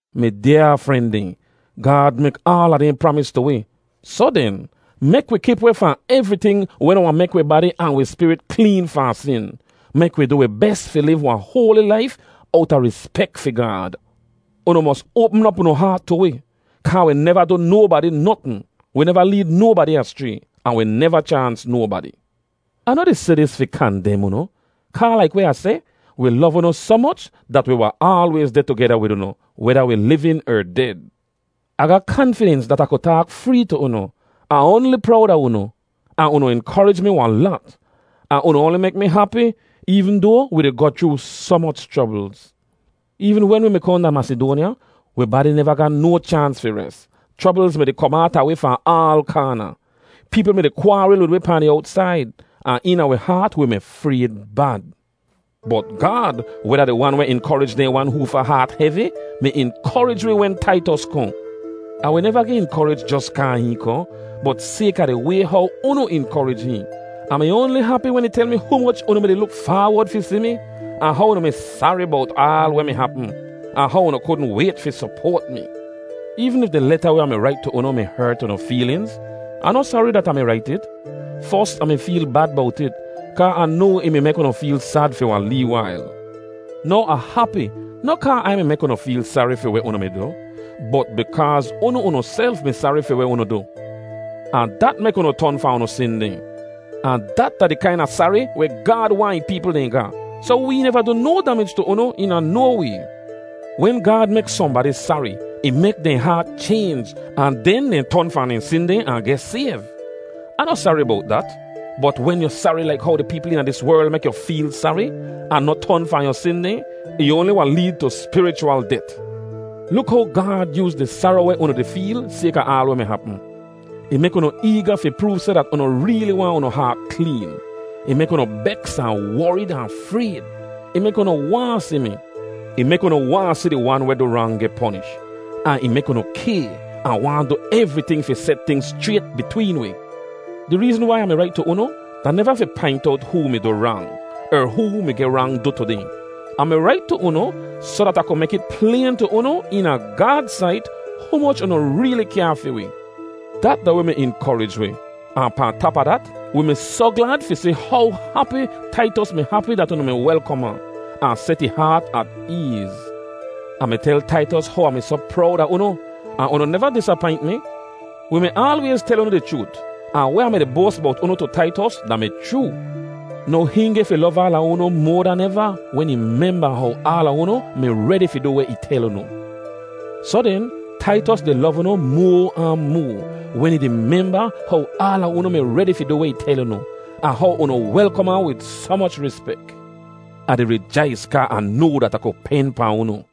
Mi dyaa fren dehn, Gaad mek aala dehn pramis tu wi, soh den, mek wi kip weh fahn evriting weh noh wahn mek wi badi ahn wi spirit kleen fahn sin. Mek wi du wi bes fi liv wahn hoali laif owta rispek fi Gaad. Unu mos oapm op unu haat tu wi, kaa wi neva du nobadi notn, wi neva leed nobadi aschray, ahn wi neva chaans nobadi. Ah noh di seh dis fi kandem unu, kaa laik weh Ah seh, wi lov unu soh moch, dat wi wahn aalwayz deh tugeda wid unu weda wi livin er ded. Ah ga kanfidens dat Ah ku taak free tu unu. Ah oanli prowd a unu, ahn unu inkorij mi wahn lat, ahn unu oanli mek mi hapi eevn doa wi di goh chroo soh moch chroblz. Eevn wen wi mi kohn da Masidoanya, wi badi neva ga no chaans fi res. Chroblz mi-di kom aata wi fahn aal kaana. Peepl mi-di kwaaril wid wi pahn di owtsaid, ahn eena wi haat wi mi frayd bad. Bot Gaad, weh da di Wan weh inkorij dehn wan hoofa haat hevi, mi inkorij wi wen Taitos kohn. Ahn wi neva geh inkorij jos kaa hihn kohn, bot sayka di way how unu inkorij hihn. Ah mi oanli hapi wen ih tel mi humoch unu mi-di luk faawod fi si mi, ahn how unu mi sari bowt aal weh mi hapm, ahn how unu kudn wayt fi sopoat mi. Eevn if di leta weh Ah mi rait tu unu mi hert unu feelinz, Ah noh sari dat Ah mi rait it. Fos, Ah mi feel bad bowt it, kaa Ah noa ih mi mek unu feel sad fi wahn lee wail. Now Ah hapi, noh kaa Ai mi mek unu feel sari fi weh unu mi du, bot bikaaz unu unuself mi sari fi weh unu du, ahn dat mek unu ton fahn unu sin dehn. Ahn dat da di kaina sari weh Gaad waahn ih peepl dehn ga, soh wee neva du no damij tu unu eena no way. Wen Gaad mek sohnbadi sari, ih mek dehn haat chaynj ahn den dehn ton fahn dehn sin dehn ahn geh sayv. Ah noh sari bowt dat. Bot wen yu sari laik how di peepl eena dis werl mek yu feel sari, ahn noh ton fahn yu sin dehn, ih oanli wahn leed tu spirichwal det. Luk how Gaad yooz di saro weh unu di feel sayka aal weh mi hapm. Ih mek unu eega fi proov seh dat unu reeli waahn unu haat kleen. Ih mek unu beks ahn worid ahn frayd. Ih mek unu waahn si mi. Ih mek unu waahn si di wan weh du rang geh ponish, ahn ih mek unu kay ahn waahn du evriting fi set tingz schrayt bitween wi. Di reezn wai Ah mi rait tu unu da neva fi paint owt hoo mi du rang er hoo mi geh rang du tu dehn. Ah mi rait tu unu soh dat Ah ku mek it playn tu unu, eena Gaad sait, humoch unu reeli kyaa fi wi. Dat da weh mi inkorij wi. Ahn pahn tap a dat, wi mi soh glad fi si how hapi Taitos mi hapi dat unu mi welkom ahn, ahn set ih haat at eez. Ah mi tel Taitos how Ah mi soh prowd a unu, ahn unu neva disapaint mi. Wi mi aalwayz tel unu di chroot, ahn weh Ah mi-di boas bowt unu tu Taitos da-mi chroo. Now hihn geh fi lov aala unu moa dan eva wen ih memba how aala unu mi redi fi du weh ih tel unu. Soh den, Taitos di lov unu moa ahn moa, wen ih di memba how aala unu mi redi fi du weh ih tel unu, ahn how unu welkom ahn wid soh moch rispek. Ah di rijais kaa Ah noa dat Ah ku pen pahn unu.